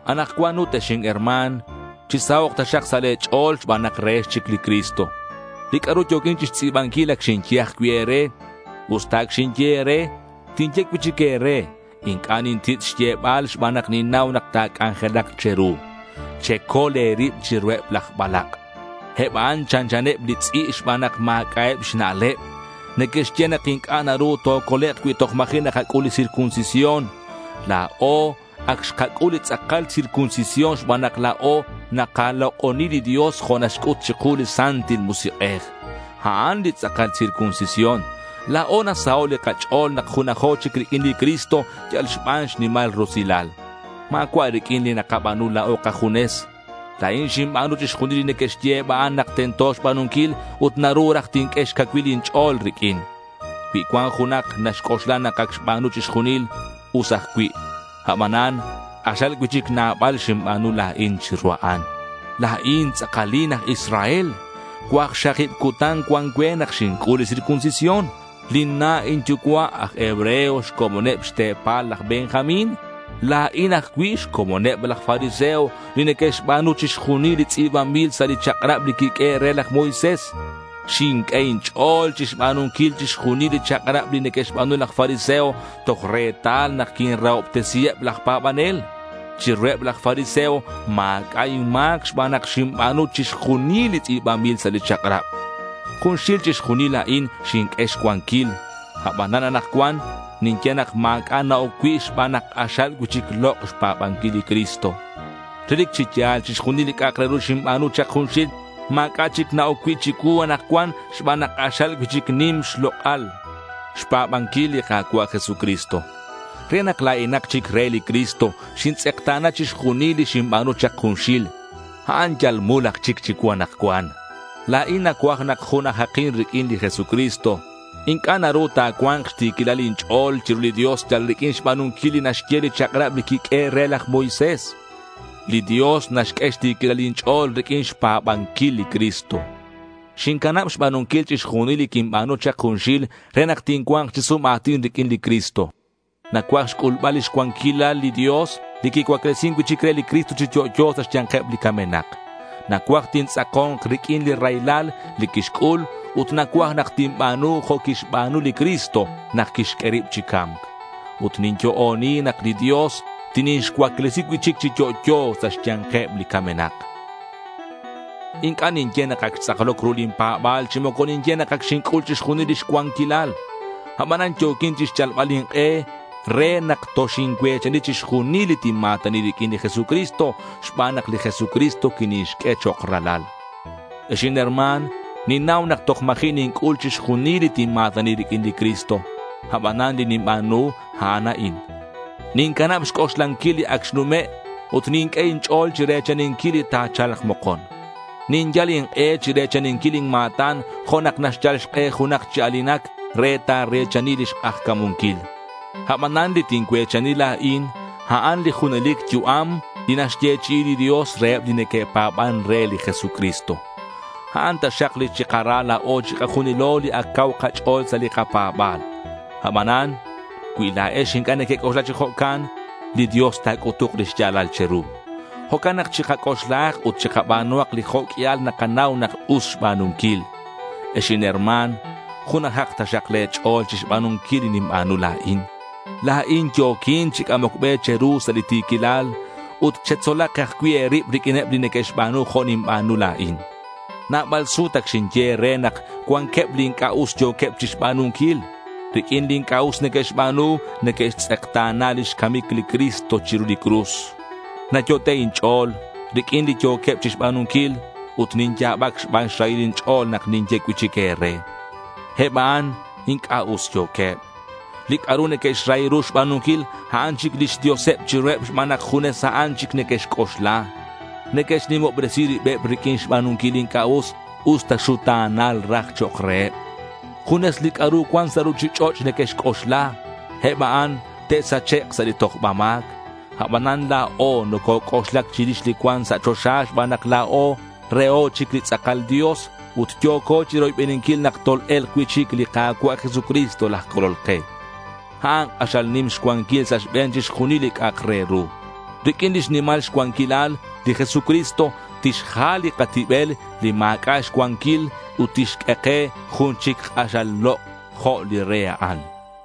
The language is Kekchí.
Anakcuan ut, ex inherma̱n, chisahok' taxak sa' le̱ ch'o̱l xban nak rehex chic li Cristo. Li c'a'ru yo̱quin chixtz'i̱banquil, ac xinye ajcui' e̱re. Usta ac xinye e̱re, tinye cui'chic e̱re. Inc'a' nintitz' xyebal xban nak ninnau nak ta̱c'anjelak che̱ru. Checol e̱rib chiruheb laj balak'. Eb a'an chanchaneb li tz'i' xban nak ma̱c'a'eb xna'leb. Neque'xye nak inc'a' naru tocolek' cui toj ma̱ji' nakac'ul li circuncisión. La̱o ac xkac'ul li tz'akal circuncisión xban nak la̱o nakalok'oni li Dios jo' naxc'ut chiku li Santil Musik'ej. A'an li tz'akal circuncisión. La̱o nasaho' li kach'o̱l nak junajo chic riq'uin li Cristo yal xban xnimal rusilal. Ma̱cua' riq'uin li nakaba̱nu la̱o kajunes. La̱in xinba̱nu chixjunil li neque'xye eb a'an nak tento xba̱nunquil ut naru raj tinq'ue xcacuilal inch'o̱l riq'uin. Cui cuan junak naxc'oxla nak ac xba̱nu chixjunil, us ajcui'. Abanan k'axal cui'chic nabal xinba̱nu la̱in chiru a'an. La̱in tz'akalin aj Israel. Cuakxakib cutan cuan cue nak xinc'ul li circuncisión. Lin na' inyucua' aj hebreo xcomoneb xte̱pal laj Benjamín. La̱in ajcui' xcomoneb laj fariseo li neque'xba̱nu chixjunil li tz'i̱banbil sa' li chak'rab li quiq'uehe' re laj Moisés. Xinq'ue inch'o̱l chixba̱nunquil chixjunil li chak'rab li neque'xba̱nu laj fariseo toj retal nak quinrahobtesiheb laj pa̱banel. Chiruheb laj fariseo ma̱c'a' inma̱c xban nak xinba̱nu chixjunil li tz'i̱banbil sa' li chak'rab. Junxil chixjunil a'in xinq'ue xcuanquil. Abanan anakcuan ninye nak ma̱c'a' na-oc cui' xban nak k'axal cui'chic lok' xpa̱banquil li Cristo. Relic chi ya̱l chixjunil li c'a'ak re ru xinba̱nu chak junxil ma̱c'a' chic na-oc cui' chicuu anakcuan xban nak k'axal cui'chic nim xlok'al xpa̱banquil li Ka̱cua' Jesucristo. Re nak la̱inak chic re li Cristo, xintz'ekta̱na chixjunil li xinba̱nu chak junxil. A'an yal mul aj chic chicuu anakcuan. La̱in nacuaj nak junajakin riq'uin li Jesucristo. Inc'a' naru ta̱cua̱nk xti̱quilal inch'o̱l chiru li Dios yal riq'uin xba̱nunquil li naxye li chak'rab li quiq'uehe' re laj Moisés. Li Dios naxq'ue xti̱quilal inch'o̱l riq'uin xpa̱banquil li Cristo. Xincanab xba̱nunquil chixjunil li quinba̱nu chak junxil re nak tincua̱nk chi sum a̱tin riq'uin li Cristo. Nacuaj xc'ulbal lix cuanquilal li Dios li quicuaclesin cui'chic re li Cristo chi yo'yo sa' xya̱nkeb li camenak. Nacuaj tintz'ako̱nk riq'uin li raylal li quixc'ul ut nacuaj nak tinba̱nu jo' quixba̱nu li Cristo nak quixq'ue rib chi ca̱mc. Ut ninyo'oni nak li Dios tinixcuaclesi cui'chic chi yo'yo sa' xya̱nkeb li camenak. Inc'a' ninye nak ac xtz'akloc ru lin pa̱ba̱l chi moco ninye nak ac xinc'ul chixjunil lix cuanquilal. Abanan yo̱quin chixyalbal ink'e re nak toxincue̱chani chixjunil li tinma̱tani riq'uin li Jesucristo xban nak li Jesucristo quinixq'ue chok' ralal. Ex inherma̱n, ninnau nak toj ma̱ji' ninc'ul chixjunil li tinma̱tani riq'uin li Cristo. Abanan li ninba̱nu, a'an a'in: Nincanab xc'oxlanquil li ac xnume' ut ninq'ue inch'o̱l chire̱chaninquil li ta̱cha̱lk mokon. Ninyal ink'e chire̱chaninquil lin ma̱tan jo' nak naxyal xk'e junak chi a̱linac re tare̱chani lix k'ajca̱munquil. Abanan li tincue̱chani la̱in, a'an li junelic yu'am li naxyechi'i li Dios reheb li neque'pa̱ban re li Jesucristo. A'an taxak li chikara la̱o chikajunilo li ac cau kach'o̱l sa' li kapa̱ba̱l. Abanan cui la̱ex inc'a' nequec'oxla chi jo'can, li Dios ta̱c'utuk li xya̱lal che̱ru. Jo'can nak chikac'oxlahak ut chikaba̱nuhak li jo' q'uial nakanau nak us xba̱nunquil. Ex inherma̱n, junajak taxak le̱ ch'o̱l chixba̱nunquil li ninba̱nu la̱in. La̱in yo̱quin chi c'amoc be che̱ru sa' li ti̱quilal. Ut chetzolak ajcui' e̱rib riq'uineb li neque'xba̱nu jo' ninba̱nu la̱in. Nabal sut ac xinye e̱re nak cuanqueb li inc'a' us yo̱queb chixba̱nunquil. Riq'uin li inc'a' us neque'xba̱nu, neque'xtz'ekta̱na lix camic li Cristo chiru li cruz. Nayot'e' inch'o̱l riq'uin li yo̱queb chixba̱nunquil ut ninya̱bac xban xrahil inch'o̱l nak ninye cui'chic e̱re. Eb a'an inc'a' us yo̱queb. Li c'a'ru neque'xrahi ru xba̱nunquil, a'an chic lix dioseb chiruheb xban nak junes a'an chic neque'xc'oxla. Neque'xnimobresi ribeb riq'uin xba̱nunquil li inc'a' us, usta xuta̱nal raj chok' reheb. Junes li c'a'ru cuan sa' ruchich'och' neque'xc'oxla. Eb a'an te'sachek' sa' li tojba ma̱c. Abanan la̱o nococ'oxlac chirix li cuan sa' choxa xban nak la̱o reho chic li tz'akal Dios ut yo̱co chiroybeninquil nak tol-e̱lk cui'chic li Ka̱cua' Jesucristo laj Colol ke. A'an k'axal nim xcuanquil sa' xbe̱n chixjunil li c'a'ak re ru. Riq'uin lix nimal xcuanquilal, li Jesucristo tixjal li katibel li ma̱c'a' xcuanquil ut tixq'ue ke jun chic k'axal lok' jo' li re a'an.